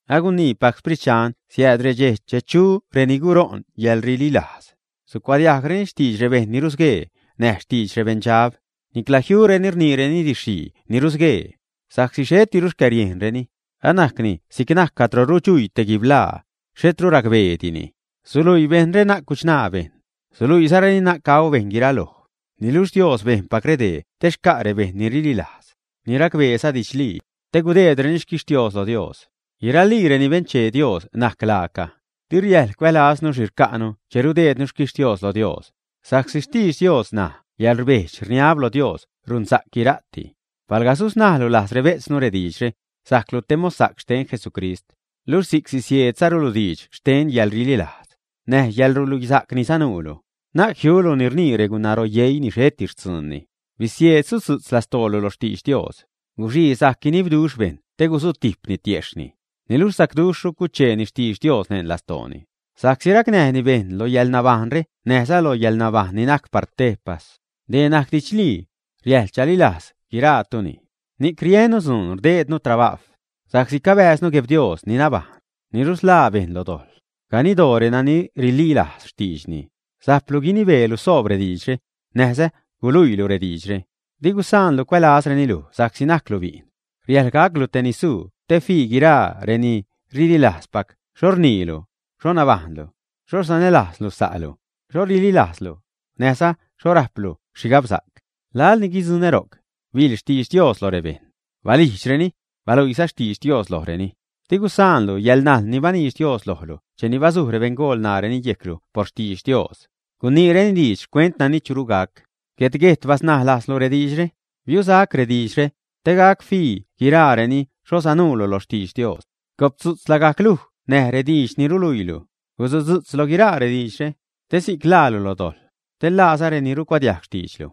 Aguniipac Sprit Dxan siääd redxej che chu reni guṟo'n yäḻrililajz, sucuadiajgreni xtidx rebejṉ ni rusguee näj xtidx rebeṉdxab, nicla jiureni rniireni didx-xhii ni rusguee, sa'csi xhetiru xcäriejnreni, anajcni si'c najc cadro rudxujy te guiblaa: xhetru racbeedini. Suluii rebejṉre na'c guchṉaa bejṉ, suluiizareni na'c gau bejṉ guiraloj, niluxh Dios bejnpac redee te xca' rebejṉ ni rlilajz, ni racbeeza didxlii, te gudeedreni xquixtios lo Dios. Guiralii reni benchee Dios najc laaca, di riäjḻ cuälaznu xhi rca'nu che rudeednu xquixtios loj Dios. Sa'csi xtidx Dios näj yäḻrbedx-rniab lo Dios runsa'c guira'ti. Palga susnajlu lajz rebejtznu rediidxre, sajclu te mossa'c xten Jesucrist, luxh si'c sisieedruzalu diidx xten yäḻrililajz, näj yäḻrluisa'c ni sanuulu. Na'c jiulu ni rnii regunaroyeii ni xheti xtzuunni. Bisieed sudzu'tz lastoolu lo xtidx Dios. Guxii sajc guinibduxh bejṉ te gusutijpni tiejxhni. Niluxh sacduxhru cucheeni xtidx Dios neṉ lastooni, sa'csi racnäjni bejṉ lo yäḻnabajṉre näjza lo yäḻnabajṉ ni najc par tejpas. Dee najc didxlii, riäjḻ chalilajz guiraatuni. Ni'c riennu dzuun, rdeednu trabajw, sa'csi cabäjznu Gueb Dios ni nabajṉ, ni rusḻaa bejṉ lo dojḻ, ganiddoo renani rililajz xtiidxni. Sajplu guinibeelu soob rediidxre, näjza guluiilu rediidxre. Di gusaanlu cuälazreni luj sa'csi najclu bi'n; riäjḻ gaclu te ni suu te fii guiraa reni rililazsa'cpac xho rniilu, xho nabajṉlu, xho sanälajzlu sa'lu, xho rililajzlu, näjza xho rajplu xhigabsa'c. Laḻ ni guidzuṉä ro'c, biḻ xtidx Dios lo rebejṉ, balijdxreni, baluiiza xtidx Dios lojreni. Di gusaanlu reyäḻnajn ni baniidx Dios lojlu cheni basuj rebeṉgool ṉaareni yejclu por xtidx Dios, guniireni diidx xcuent nani churu gac. Guet-guejt basnaj lajzlu rediidxre, biusa'c rediidxre, te gac fii guiraareni xho sanuulu lo xtidx Dios. Gopdzu'tz lagajc luj näjza rediidx ni ruluiilu; guzudzu'tz lo guiraa rediidxre, te si'c ḻaalu lo dojḻ, te ḻaaza reni rucuadiajg xtiidxlu.